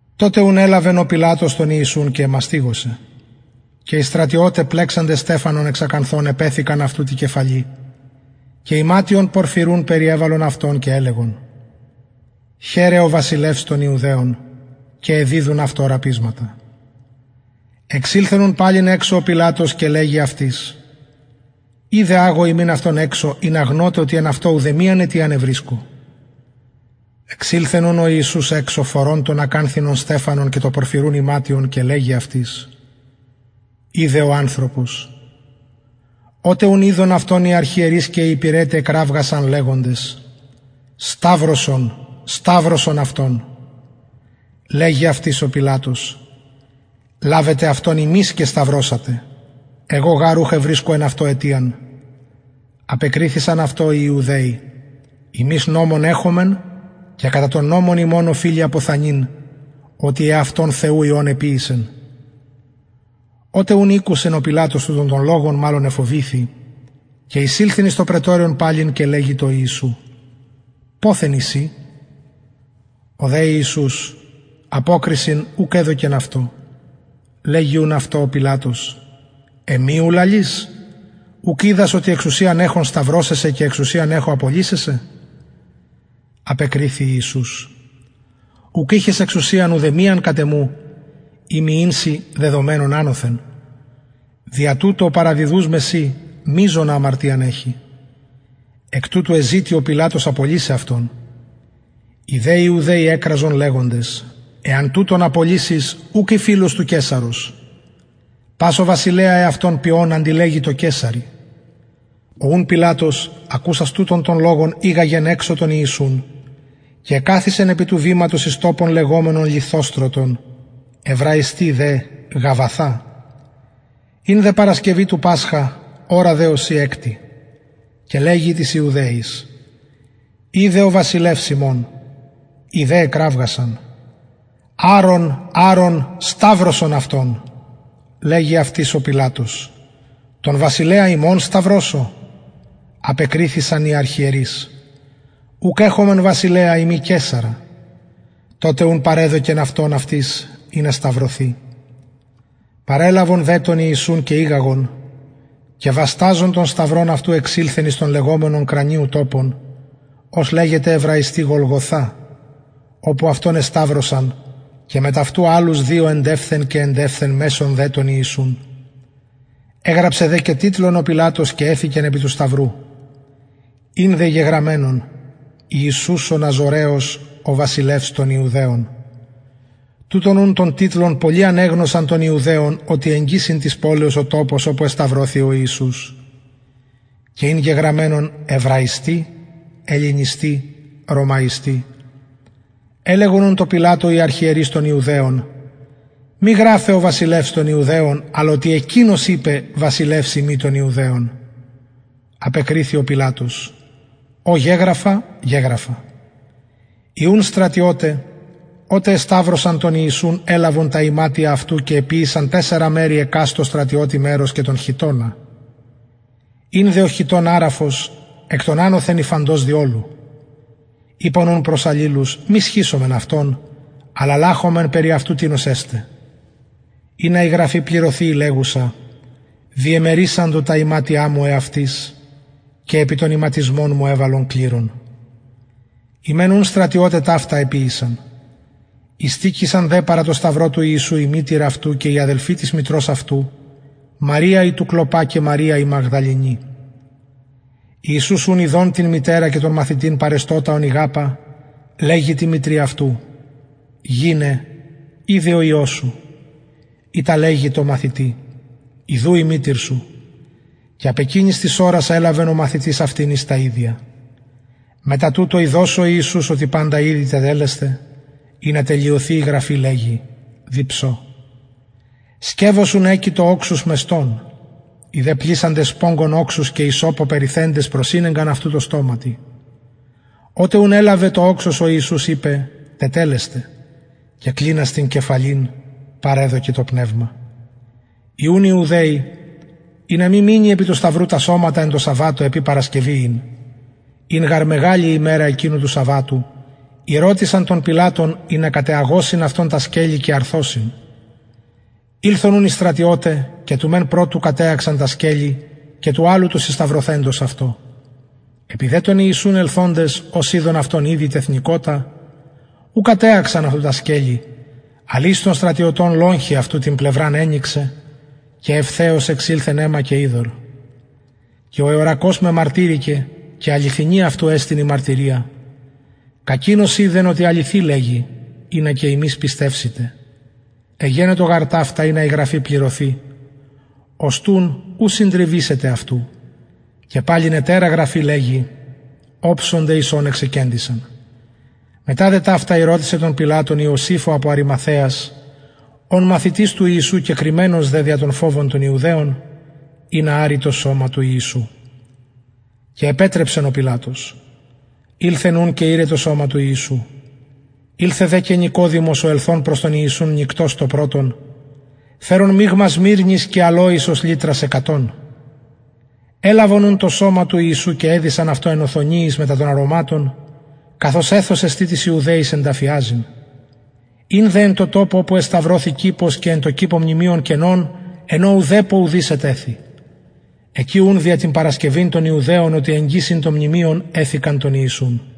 τοτε ουν ελαβεν ο πιλατος τον ιησουν και εμαστιγωσεν και οι στρατιωται πλεξαντες στεφανον εξ ακανθων επεθηκαν αυτου τη κεφαλη και ιματιον πορφυρουν περιεβαλον αυτον και ελεγον χαιρε ο βασιλευς των ιουδαιων και εδιδουν αυτω ραπισματα εξηλθεν ουν παλιν εξω ο πιλατος και λεγει αυτοις ιδε αγω υμιν αυτον εξω ινα γνωτε οτι εν αυτω ουδεμιαν αιτιαν ευρισκω εξηλθεν ουν ο ιησους εξω φορων τον ακανθινον στεφανον και το πορφυρουν ιματιον και λεγει αυτοις ιδε ο ανθρωπος οτε ουν ειδον αυτον οι αρχιερεις και οι υπηρεται εκραυγασαν λεγοντες σταυρωσον σταυρωσον αυτον λεγει αυτοις ο πιλατος λαβετε αυτον υμεις και σταυρωσατε εγω γαρ ουχ ευρισκω εν αυτω αιτιαν απεκριθησαν αυτω οι ιουδαιοι ημεις νομον εχομεν και κατα τον νομον ημων οφειλει αποθανειν οτι εαυτον υιον θεου εποιησεν οτε ουν ηκουσεν ο πιλατος τουτον τον λογον μαλλον εφοβηθη και εισηλθεν εις το πραιτωριον παλιν και λεγει τω ιησου ποθεν ει συ ο δε ιησους αποκρισιν ουκ εδωκεν αυτω λεγει ουν αυτω ο πιλατος εμοι ου λαλεις ουκ οιδας οτι εξουσιαν εχω σταυρωσαι σε και εξουσιαν εχω απολυσαι σε απεκριθη ιησους ουκ ειχες εξουσιαν ουδεμιαν κατ εμου ει μη ην σοι δεδομενον ανωθεν δια τουτο ο παραδιδους με σοι μειζονα αμαρτιαν εχει εκ τουτου εζητει ο πιλατος απολυσαι αυτον οι δε ιουδαιοι εκραζον λεγοντες εαν τουτον απολυσης ουκ ει φιλος του καισαρος πας ο βασιλεα εαυτον ποιων αντιλεγει τω καισαρι ο ουν πιλατος ακουσας τουτον τον λογον ηγαγεν εξω τον ιησουν και εκαθισεν επι του βηματος εις τοπον λεγομενον λιθοστρωτον εβραιστι δε γαββαθα ην δε παρασκευη του πασχα ωρα δε ωσει εκτη και λεγει τοις ιουδαιοις ιδε ο βασιλευς υμων οι δε εκραυγασαν αρον αρον σταυρωσον αυτον λεγει αυτοις ο πιλατος τον βασιλεα υμων σταυρωσω απεκριθησαν οι αρχιερεις ουκ εχομεν βασιλεα ει μη καισαρα τοτε ουν παρεδωκεν αυτον αυτοις ινα σταυρωθη παρελαβον δε τον ιησουν και ηγαγον και βασταζων τον σταυρον αυτου εξηλθεν εις τοπον λεγομενον κρανιου τοπον ος λεγεται εβραιστι γολγοθα οπου αυτον εσταυρωσαν και μετ αυτου αλλους δυο εντευθεν και εντευθεν μεσον δε τον ιησουν εγραψεν δε και τιτλον ο πιλατος και εθηκεν επι του σταυρου ην δε γεγραμμενον ιησους ο ναζωραιος ο βασιλευς των ιουδαιων τουτον ουν τον τιτλον πολλοι ανεγνωσαν των ιουδαιων οτι εγγυς ην ο τοπος της πολεως οπου εσταυρωθη ο ιησους και ην γεγραμμενον εβραιστι ελληνιστι ρωμαιστι ελεγον ουν τω πιλατω οι αρχιερεις των ιουδαιων μη γραφε ο βασιλευς των ιουδαιων αλλ οτι εκεινος ειπεν βασιλευς ειμι των ιουδαιων απεκριθη ο πιλατος ο γεγραφα γεγραφα οι ουν στρατιωται οτε εσταυρωσαν τον ιησουν ελαβον τα ιματια αυτου και εποιησαν τεσσαρα μερη εκαστω στρατιωτη μερος και τον χιτωνα ην δε ο χιτων αραφος εκ των ανωθεν υφαντος δι ολου ειπον ουν προς αλληλους μη σχισωμεν αυτον αλλα λαχωμεν περι αυτου τινος εσται ινα η γραφη πληρωθη η λεγουσα διεμερισαντο τα ιματια μου εαυτοις και επι τον ιματισμον μου εβαλον κληρον οι μεν ουν στρατιωται ταυτα εποιησαν ειστηκεισαν δε παρα τω σταυρω του ιησου η μητηρ αυτου και η αδελφη της μητρος αυτου μαρια η του κλωπα και μαρια η μαγδαληνη ιησους ουν ιδων την μητερα και τον μαθητην παρεστωτα ον ηγαπα λεγει τη μητρι αυτου γυναι ιδου ο υιος σου ειτα λεγει τω μαθητη ιδου η μητηρ σου και απ εκεινης της ωρας ελαβεν ο μαθητης αυτην εις τα ιδια μετα τουτο ιδων ο ιησους οτι παντα ηδη τετελεσται ινα τελειωθη η γραφη λεγει διψω σκευος ουν εκειτο οξους μεστον οι δε πλησαντες σπογγον οξους και υσσωπω περιθεντες προσηνεγκαν αυτου τω στοματι οτε ουν ελαβεν το οξος ο ιησους ειπεν τετελεσται και κλινας την κεφαλην παρεδωκεν το πνευμα οι ουν ιουδαιοι ινα μη μεινη επι του σταυρου τα σωματα εν τω σαββατω επει παρασκευη ην ην γαρ μεγαλη η ημερα εκεινου του σαββατου ηρωτησαν τον πιλατον ινα κατεαγωσιν αυτων τα σκελη και αρθωσιν ηλθον ουν οι στρατιωται και του μεν πρωτου κατεαξαν τα σκελη και του αλλου του συσταυρωθεντος αυτω επι δε τον ιησουν ελθοντες ως ειδον αυτον ηδη τεθνηκοτα ου κατεαξαν αυτου τα σκελη αλλ εις των στρατιωτων λογχη αυτου την πλευραν ενυξεν και ευθεως εξηλθεν αιμα και υδωρ και ο εωρακως μεμαρτυρηκεν και αληθινη εστιν αυτου η μαρτυρια κακεινος οιδεν οτι αληθη λεγει ινα υμεις πιστευσητε εγενετο γαρ ταυτα ινα η γραφη πληρωθη οστουν ου συντριβησεται απ αυτου και παλιν ετερα γραφη λεγει οψονται εις ον εξεκεντησαν μετα ταυτα ηρωτησεν τον πιλατον ιωσηφ ο απο αριμαθαιας ων μαθητης του ιησου κεκρυμμενος δε δια τον φοβον των ιουδαιων ινα αρη το σωμα του ιησου και επετρεψεν ο πιλατος ηλθεν ουν και ηρεν το σωμα του ιησου ηλθεν δε και νικοδημος ο ελθων προς τον ιησουν νυκτος το πρωτον φερων μιγμα σμυρνης και αλοης ως λιτρας εκατον ελαβον ουν το σωμα του ιησου και εδησαν αυτο εν οθονιοις μετα των αρωματων καθως εθος εστιν τοις ιουδαιοις ενταφιαζειν ην δε εν τω τοπω οπου εσταυρωθη κηπος και εν τω κηπω μνημειον καινον εν ω ουδεπω ουδεις ετεθη εκει ουν δια την παρασκευην των ιουδαιων οτι εγγυς ην το μνημειον εθηκαν τον ιησουν